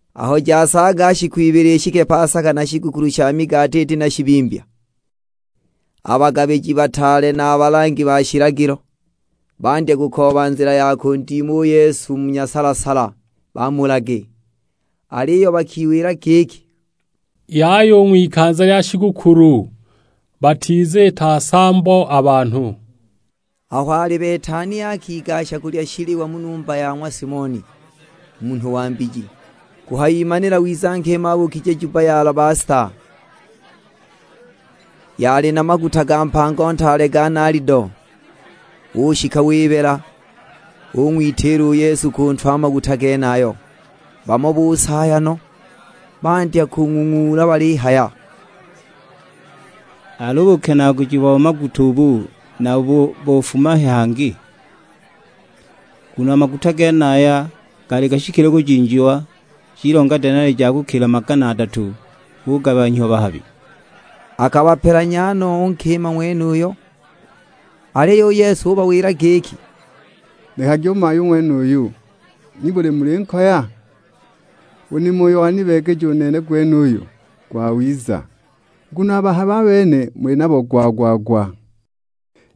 Aho jasaaga shiku ibili ishike pasaka na shigukulu sha migati iti na shibimbya, a bagabiji bataale na a balangi ba shilagilo, bandya kukooba nzila ya kundima u Yesu mu nyasala-sala bamulage. Aliyo bakiwila giki, "Yaya u ng'wikanza lya shigukulu, batiziita nsambo a banhu." Aho ali Betania akigasha kulya shiliwa mu numba ya ng'wa Simoni, munhu wa mbiji. Kuhayimanila wiza nkima abuukije jubba ya alabasta, yali na maguta ga mpango ntaale ga nalido. Ushika wibela, ung'witiila u Yesu ku ntwe a maguta genayo. Bamo busaaya no, bandya kung'ung'uula balihaya, "Al'u bukenaaguji bo maguta ubu nabo bofuma he hangi? Nguno a maguta genaya gaali gashikile kujinjiwa, jilonga denali ja kukila ha magana adatu, bugabanhyiwa bahabi!" Akabapelanya no u nkima ng'wenuyo. Aliyo u Yesu ubawila giki, "Nekagi u mayu ng'wenuyu, nibuli mulinkoya? U nimo uyo wanibeegeja nene gwenuyu gwawiza. Nguno a bahabi a bene muli nabo gwa-gwa-gwa,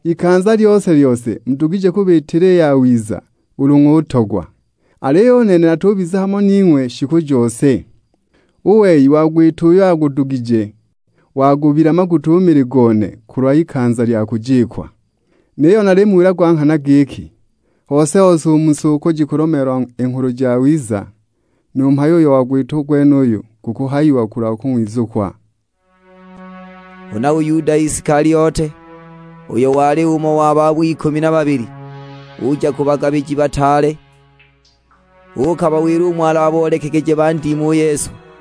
ikanza lyose-lyose mudugije kubiitila i yawiza ulu ng'utogwa, aliyo u nene natubiza hamo ning'we shiku jose. U wei wagwita uyo agudugije, wagubila maguta u mili gone kulwa ikanza lya kujikwa. Niyo nalimuwila gwa nghana giki, hose-hose u mu si uko jikulomeelwa i Nghulu Jawiza, nu mhayo uyo wagwita gwenuyu gukuhayiwa kulwa kung'wizukwa." Huna u Yuda Isikaliote, uyo wali umo wa babo ikumi na babili, uja ku bagabiji bataale, uukabawila umo alaboolekegeje bandime u Yesu.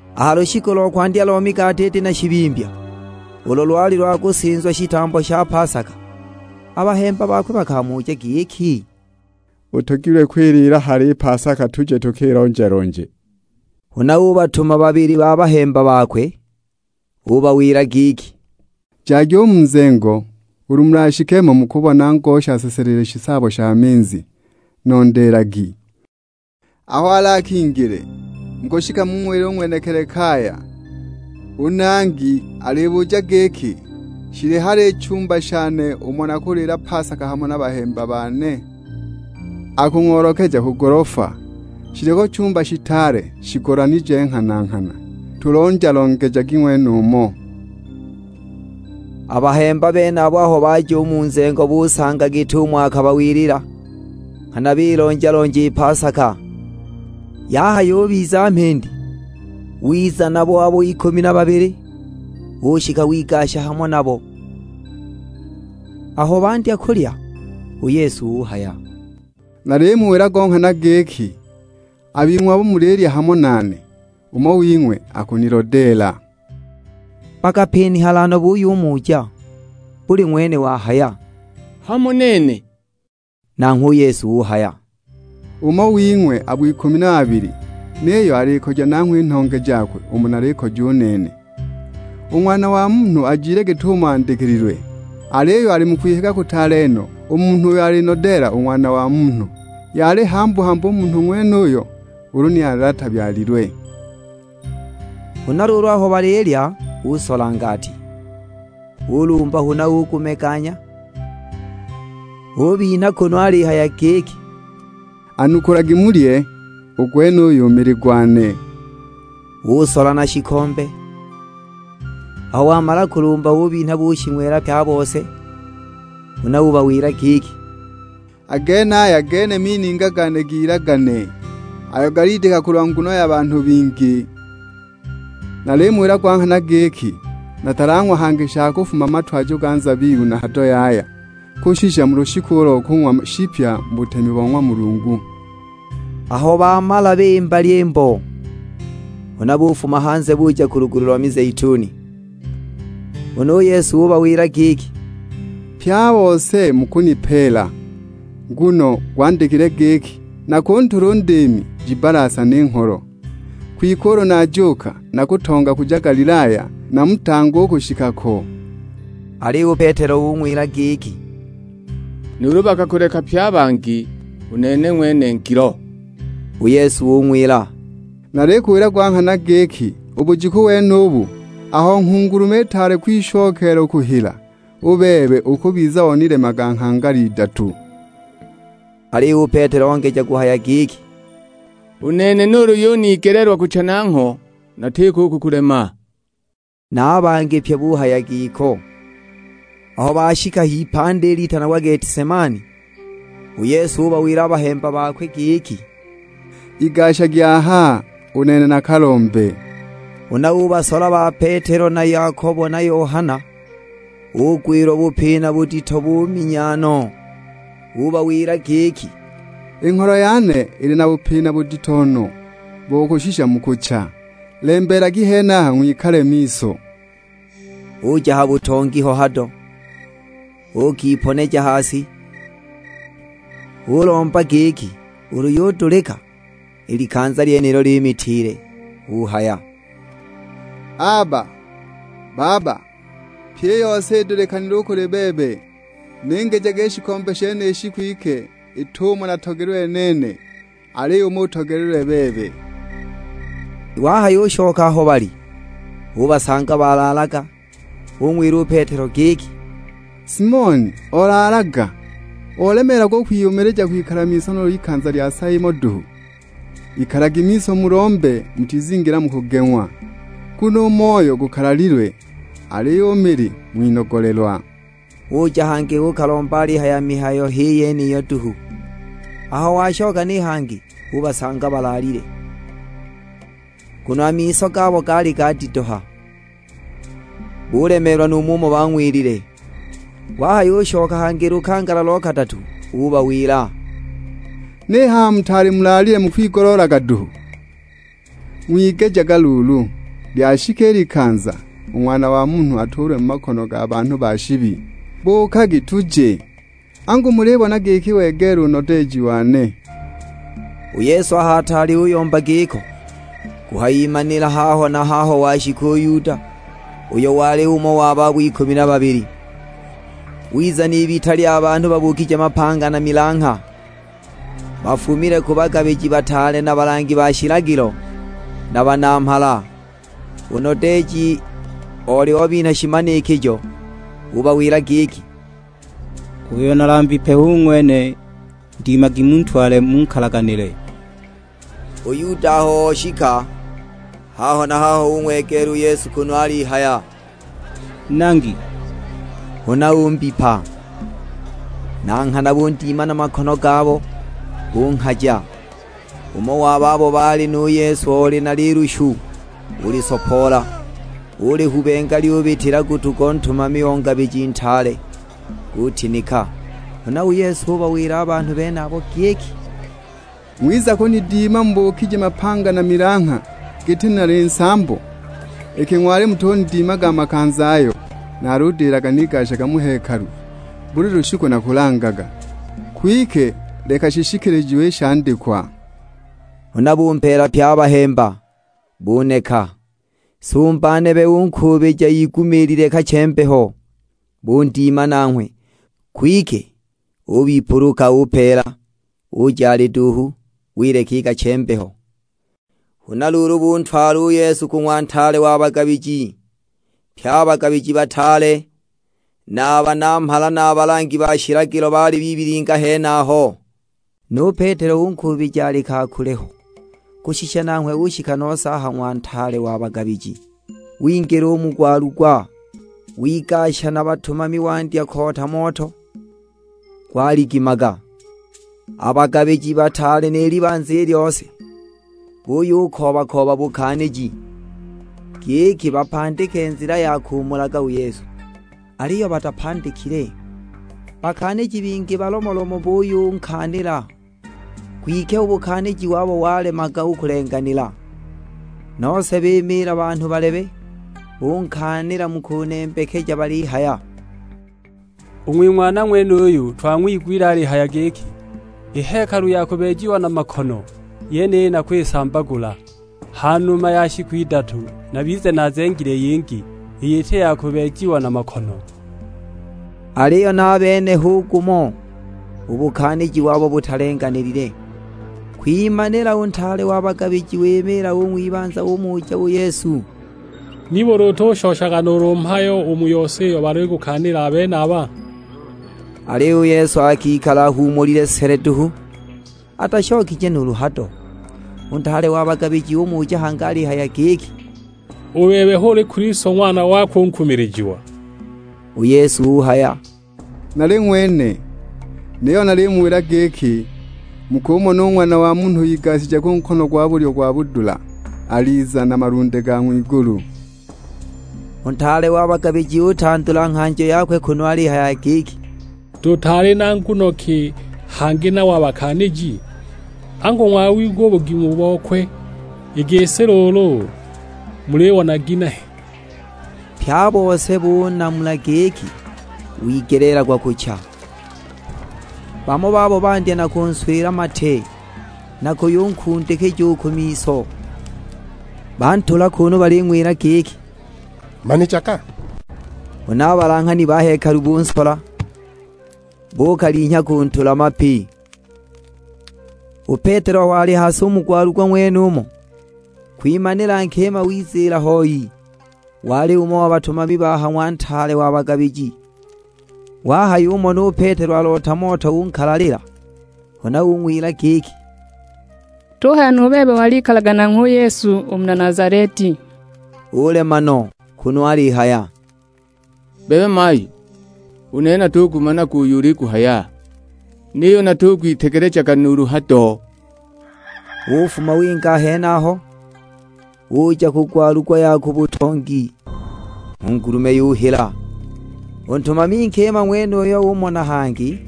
A ha lushiku lo kwandya lo migati iti na shibimbya, ulo lwali lwa kusinzwa shitambo sha pasaka, a bahemba bakwe bakamuja giki, "Utogilwe kwiliila hali i pasaka tuje tukilonja-lonje?" Huna ubatuma babili ba bahemba bakwe; ubawila giki, "Jagi u mu nzengo, ulu mulashike mo mukumona ngosha aseselile shisaabo sha minzi, nondeelagi. Aho alakingile, mukushika mung'wile u ng'wenekili kaya, 'U Nangi alibuja giki: Shili hali i chumba shane umo nakuliila pasaka hamo na bahemba bane?' Akung'oolekeja ku golofa, shiliko chumba shitaale shigolanije nghana-nghana, tulonja-longejagi ng'wenumo." A bahemba benabo aho baja u mu nzengo busanga git'umo akabawilila, nghana bilonja-lonja i pasaka. Yahayubiza mhindi, wiza nabo abo ikumi na babili, ushika wigasha hamo nabo. Aho bandya kulya, u Yesu uhaya, "Nalimuwila go nghana giki, a bing'we abo mulilya hamo nane, umo wing'we akunilodeela!" Bakapinihala no buyumuja; buli ng'wene wahaya, "Hamo nene?" Nanghwe u Yesu uhaya, "Umo wing'we abo ikumi na babili, niyo alikoja nanghwe i nhonge jakwe umo nalikoja u nene! U Ng'wana wa Munhu ajile git'umo andikililwe, aliyo ali mu kwihiga kutaale no u munhu uyo alinodeela u Ng'wana wa Munhu. Yali hambu-hambu u munhu ng'wenuyo ulu ni oli atabyalilwe!" Huna luulu aho balilya, usola ngati. Ulumba huna ugumeganya, ubinha kunu alihaya giki, "Anukulagi mulye, u gwenuyu mili gwane." Usola na shikombe, aho wamala kulumba ubinha bushing'wela pye a bose. Huna ubawila giki, "A genaya gene mininga gane g'ilagane, ayo galidika kulwa nguno ya banhu bingi. Nalimuwila gwa nghana giki, natalang'wa hangi sha kufuma mu matwajo ga nzabibu na hado yaya kushisha mu lushiku lo kung'wa shipya mu butemi bo ng'wa Mulungu." Aho bamala bimba lyimbo, huna bufuma hanze buja ku lugulu lo mizeituni. Huna u Yesu ubawila giki, "Pye a bose mukunipeela, nguno gwandikilwe giki, 'Nakuntula u ndiimi, jibbalasane i ngholo!' Kwike ulu najuuka, nakutonga kuja Galilaya, namutange u kushika ko." Aliyo u Petelo ung'wila giki, "Nuulu bakakuleka pye a bangi, u nene ng'wene ngilo!" U Yesu ung'wila, "Nalikuwila gwa nghana giki, u bujiku wenubu, aho nghungulume itaali kwishokeela kuhila, u bebe ukubiza onilemaga nghangala idatu!" Aliyo u Petelo ongeja kuhaya giki, "U nene nuulu yunigeleelwa kucha nangho, natiko u kukulema!" Na a bangi pye buhaya giko. Aho bashika h'ipandi litanagwa Getisemani, u Yesu ubawila a bahemba bakwe giki, "Igashagi aha, u nene nakalombe." Huna ubasola ba Petelo na Yakobo na Yohana, ugwilwa bupina budito buminya no. Ubawila giki, "I ngholo yane ili na bupina budito no bo kushisha mu kucha. Lembeelagi henaha ng'wikale miso." Uja ha butongi ho hado, uukiponeja ha si, ulomba giki ulu yudulika, i likanza lyenilo limitiile. Uhaya, "Aba, Baba, pyi i yose idulikanile u kuli bebe, ningijage i shikombe shenishi, kwike it'umo natogelilwe nene, aliyo umo utogelilwe bebe!" Wahayushoka aho baali, ubasanga balaalaga, ung'wila u Petelo giki, "Simoni, olaalaga? Olemeelwa u kwiyumilija kwikala miso nuulu ikanza lya sa imo duhu? Ikalagi miso mulombe mutizingila mu kugeng'wa, nguno u moyo gukalalilwe, aliyo u mili ng'winogolelwa!" Uja hangi uukalomba alihaya mihayo h'i yeniyo duhu. Aho washoka ni hangi ubasanga balaalile, nguno a miso gabo gaali gadidoha; bulemeelwa nu mumo bang'wilile. Wahayushoka hangi lukangala lo kadatu ubawila, "Ni haha mutaali mulaalile mukwigoloolaga duhu? Ng'wigejaga luulu. Lyashika i likanza, u Ng'wana wa Munhu atuulwe mu makono ga banhu ba shibi. Buukagi tuje, angu mulibona giki wegeela u nodeeji wane!" U Yesu aho ataali uyomba giko, kuhayimanila haho na haho washika u Yuda, uyo wali umo wa babo ikumi na babili. Wiza n'ibita lya banhu babuukije mapanga na milangha, bafumile ku bagabiji bataale na balangi ba shilagilo, na banamhala. U nodeeji oli obinha shimanikijo; ubawila giki, "Uyo nalambipe hu ng'wene, ndimagi muntwale munkalaganile!" U Yuda aho oshika, haho na haho ung'wegeela u Yesu kunu alihaya, "Nangi!" Huna umbipa. Na nghana bundima na makono gabo, bunghaja! Umo wa babo baali nu Yesu oli na lilushu, ulisopoola; ulihubenga lyubitila gutu go ntumami o ngabiji ntaale, gutinika! Huna u Yesu ubawila a banhu benabo giki, "Ng'wiza kunidima mubuukije mapanga na milangha giti nali nsambo? Iki ng'wali mutunidimaga a makanza ayo naludilaga nigashaga mu hekalu buli lushiku nakulangaga! Kwike leka shishikilijiwe i shandikwa!" Huna bumpeela pye a bahemba, buneka! Sumba nebe unkuubija igumiilile kache-mbeho, bundima nanghwe. Kwike ubipuluka upeela; uja ali duuhu, wileka i kache-mbeho! Huna luulu buntwala u Yesu ku ng'wa ntaale wa bagabiji. Pye a bagabiji bataale, na a banamhala na a balangi ba shilagilo baali bibilingila henaho. Nu Petelo unkuubija ali ka kule ho, kushisha nanghwe ushika nose a ha ng'wa ntaale wa bagabiji. Wingila u mu gwalugwa, wigasha na batumami wandya koota moto, gwaligimaga! A bagabiji bataale ni libanza i lyose, buyukooba-kooba bukaaniji, giki bapandike nzila ya kumulaga u Yesu, aliyo batapandikile. Bakaaniji bingi balomolomo buyunkaanila, kwike u bukaaniji wabo walemaga u kulenganila. Nose bimiila banhu balebe, bunkaanila mu kunembekeja balihaya, "U ng'wing'wana ng'wenuyu twang'wigwile alihaya giki, 'I hekalu ya kubeejiwa na makono yeniyi nakwisambagula, ha numa ya shiku idatu nabize naazengile yingi, iyo iti ya kubeejiwa na makono!' " Aliyo na a bene hu gumo, u bukaaniji wabo butalenganilile. Kwimanila u ntaale wa bagabiji wimiila u ng'wibanza; umuja u Yesu, "Nibuli utushoshaga nuulu mhayo u mu yose iyo balikukaanila a benaba?" Aliyo u Yesu akikala ahuumulile sele duhu, atashokije nuulu hado. U ntaale wa bagabiji umuja hangi alihaya giki, "U bebe, h'uli Kilisto ng'wana wakwe u nkumilijiwa?" U Yesu uhaya, "Nali ng'wene, niyo nalimuwila giki, mukumona u Ng'wana wa Munhu igashije ku nkono gwa bulyo gwa budula, aliza na malunde ga ng'wigulu." U ntaale wa bagabiji utandula nghanjo yakwe kunu alihaya giki, "Tutaali na nguno ki hangi nabo a bakaaniji? Angu ng'wawigwa u bugimu bokwe! I gisi luulu mulibona ginehe?" Pye a bose bunamula giki, wigeleelagwa kucha. Bamo babo bandya na kunswila mate, na kuyunkundikija u ku miso, bantula kunu baling'wila giki, "Manijaga!" Huna a balanghani ba hekalu bunsola, bukalinhya kuntula mapi! U Petelo aho ali ha si u mu gwalugwa ng'wenumo, kwimanila nkima wiziila hoi; wali umo wa batumami ba ha ng'wa ntaale wa bagabiji. Wahayumona u Petelo aloota moto unkalalila, huna ung'wila giki, "Tuhaya nu bebe walikalaga nanghwe u Yesu, u muna Nazaleti!" Ulema no; kunu alihaya, "Bebe mayu, u nene natugumanaga uyo uliguhaya, niyo natugwitegelejaga nuulu hado!" Ufuma winga a henaho, uja ku gwalugwa ya ku butongi, (nghungulume yuhila). U ntumami nkima ng'wenuyo umona hangi;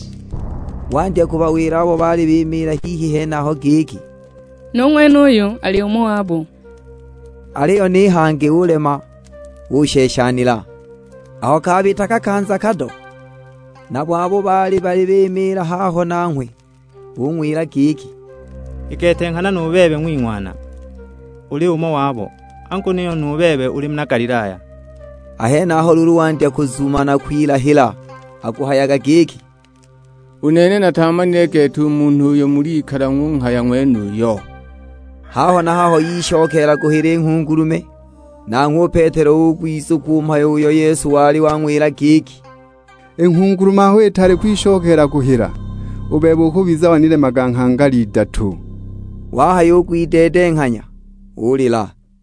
wandya kubawila abo baali bimiila hihi henaho giki, "Nu ng'wenuyu ali umo wabo!" Aliyo ni hangi ulema usheshanila! Aho kabita kakanza kado, nabo abo baali bimiila haho nanghwe, bung'wila giki, "I gete nghana nu bebe ng'wing'wana uli umo wabo, angu niyo nu bebe uli muna Galilaya!" A henaho luulu wandya kuzuma na kwilahila; akuhayaga giki, "U nene nataamanile gete u munhu uyo mulikala ng'unghaya ng'wenuyo!" Haho na haho yishokeela kuhila i nghungulume. Nanghwe u Petelo ugwizukwa u mhayo uyo Yesu wali wang'wila giki, "I nghungulume aho itaali kwishokeela kuhila, u bebe ukubiza wanilemaga nghangala idatu!" Wahayugwideedenghanya ulila!